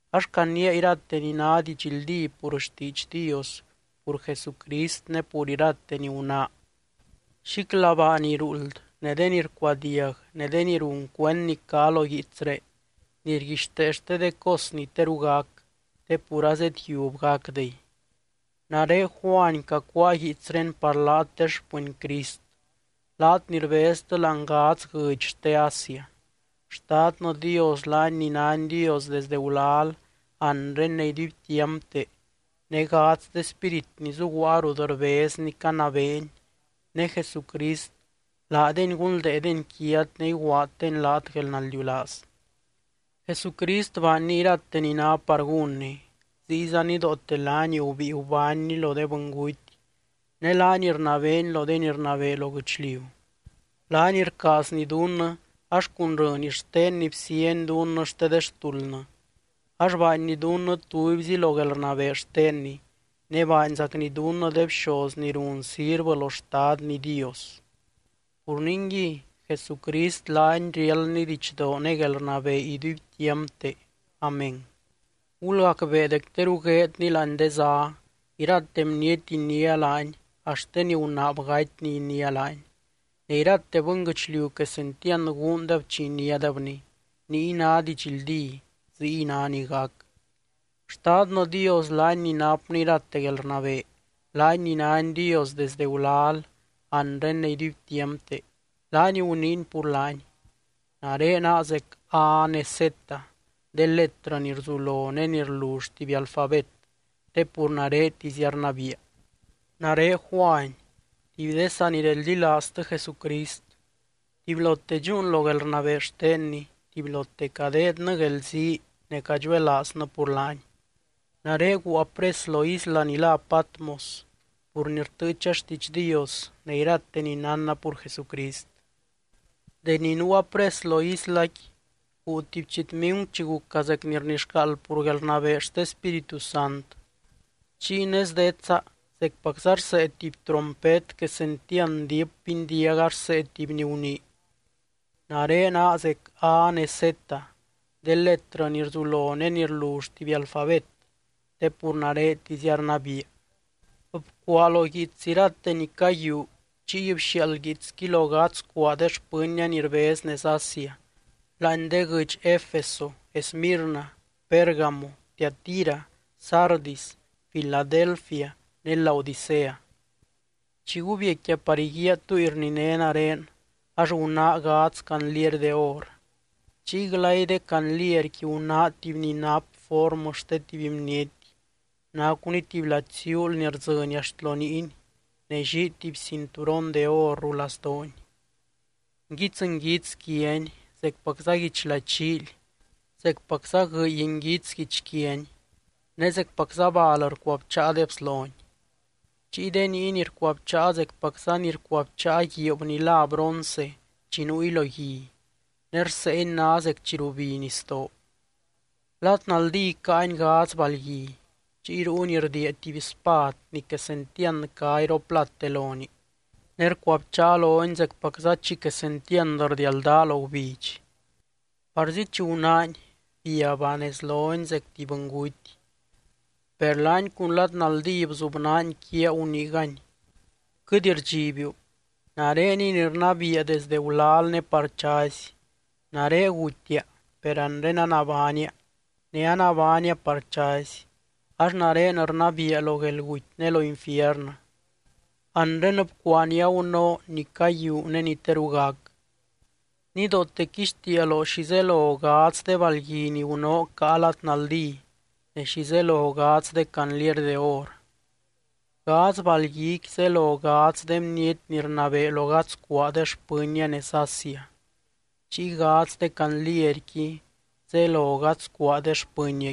Ax caniia irate ni ná didxldí pur xtiidx Dios, pur Jesucrist ne pur irate ni gunáa. Xíclabaa ni ruuld, ne de ni rcuadiag ne de ni run cuend ni cá lo guiitsré ni rguixtee xte de cos ni teru gac, te pur azedyiub gacdey. Nare Juany cacuáa guiitsré par laat de xpɨny Crist, laat ni rbeztɨ láani gadz guɨdx xte Asia. Xtadnɨ Dios, laany ni nány Dios desde gulal, anre ne iduibtiampte, ne gadz de spírit ni zuguaa rut rbezny canabeeny, ne Jesucrist, laadeny gunldeedeny quiat ne iguaaddeny laat guelnaldiulaaz. Jesucrist baanny irate ni ná par gúnny, ziyza nidoote laany gubíi gubánny lo de bɨnguty ne laany rnabeeny lo de ni rnabee lo guɨchliu. Laany rcaazny dunnɨ ax cun rɨny xtenny bsieny dunnɨ xte de xtuldnɨ ax baanny dunnɨ tubyzi lo guelrnabee xtenny, ne baanzacny dunnɨ de bxoz ni run sirvɨ lo Xtadny Dios. Pur ningui, Jesucrist laany riáldny didxdoo ne guelrnabee iduibtiampte. Amén. ¡Gulgacbee dec teru gueedny láani de zá! Irate bniety iniá laany axt de ni gunaab gatyny iniá laany, ne irate bɨnguɨchliu quesentiand guundeb chi iniádebny. Niy ná didxldí. Ziy ná ni gac. Xtadnɨ Dios laany ni napny irate guelrnabee, laany ni nány Dios desde gulal, anre ne iduibtiampte, laany guniiny pur laany: “Nare naa zec A ne Z, de letrɨ ni rzulo ne ni rlull tuby alfabet, te pur naretizia rnabiia.” Nare Juany tuby de sanireldilaaztɨ Jesucrist. Tubylote dxúun lo guelrnabee xtenny, tubylote cadeednɨ guelzii ne cadxuelaaznɨ pur laany. Nare guua pres lo isla ni lá Patmos pur ni rtɨɨcha xtiidx Dios ne irate ni nánna pur Jesucrist. Deni nuua pres lo islaqui, guu tuby chitmingu chi guca zec ni rnixcaald pur guelrnabee xte Spíritu Sant, chiy nez detsa zecpacza rsee tuby trompet quesentiand diip bindiaga rsee tuby ni gunii: —Nare naa zec A ne Z, de letrɨ ni rzulo ne ni rlull tuby alfabet, te pur naretizia rnabiia. Bcuaa lo guiits irate ni caguiuu chiy bxiaald guiitsqui lo gadz cuaa de xpɨnnia ni rbez nez Asia, láani de guɨdx Efeso, Esmirna, Pérgamo, Tiatira, Sardis, Filadelfia ne Laodicea. Chi gubiecquia par iguíaa túy rniné nare ax gunáa gadz candliery de or. Chiy glay de candlierqui gunáa tuby ni nap formɨ xte tuby bniety, nacuny tuby lady ziuul ni rdzɨny axt lo niiny ne llii tuby cinturon de or rulazdoony. Nguits nguits quiany zecpacza guichlady llíily, zecpacza guɨy nguits guichquiany, ne zecpacza bal rcuabcháa de bslony. Chiy de niiny rcuabcháa zecpacza ni rcuabcháa guiib ni lá bronce chi nuuy lo gui, ne rseeny ná zec chi rubi nisdoo. Lad naldí caany gadz balgui. Chiy ruuny rdiia tuby spad ni quesentiand cá iroplate lonii, ne rcuabcháa lony zecpacza chi quesentiand rdialdaa lo gubidx. Parzi chi gunáany, biabba nez lony zec tuby bɨnguty. Per laany cun lad naldí bzubnaany quiaa, guniigany: —Quɨt rdxibiu, nareniy ni rnabiia desdɨ gulal ne par chazy. Nare gutia, per anre anabánia, ne anabánia par chazy, ax nare rnabiia lo guelguty ne lo infiernɨ. Anre bcuaa ni agunóo, ni caguiuu ne ni teru gac. Nidoote quixtiia loo xi zelo gadz de balgui ni gunóo caa lad naldí ne xi zelo gadz de candliery de or. Gadz balguiqui zelo gadz de bniety ni rnabee lo gadz cuaa de xpɨnnia nez Asia, chiy gadz de candlierqui zelo gadz cuaa de xpɨnniaqui.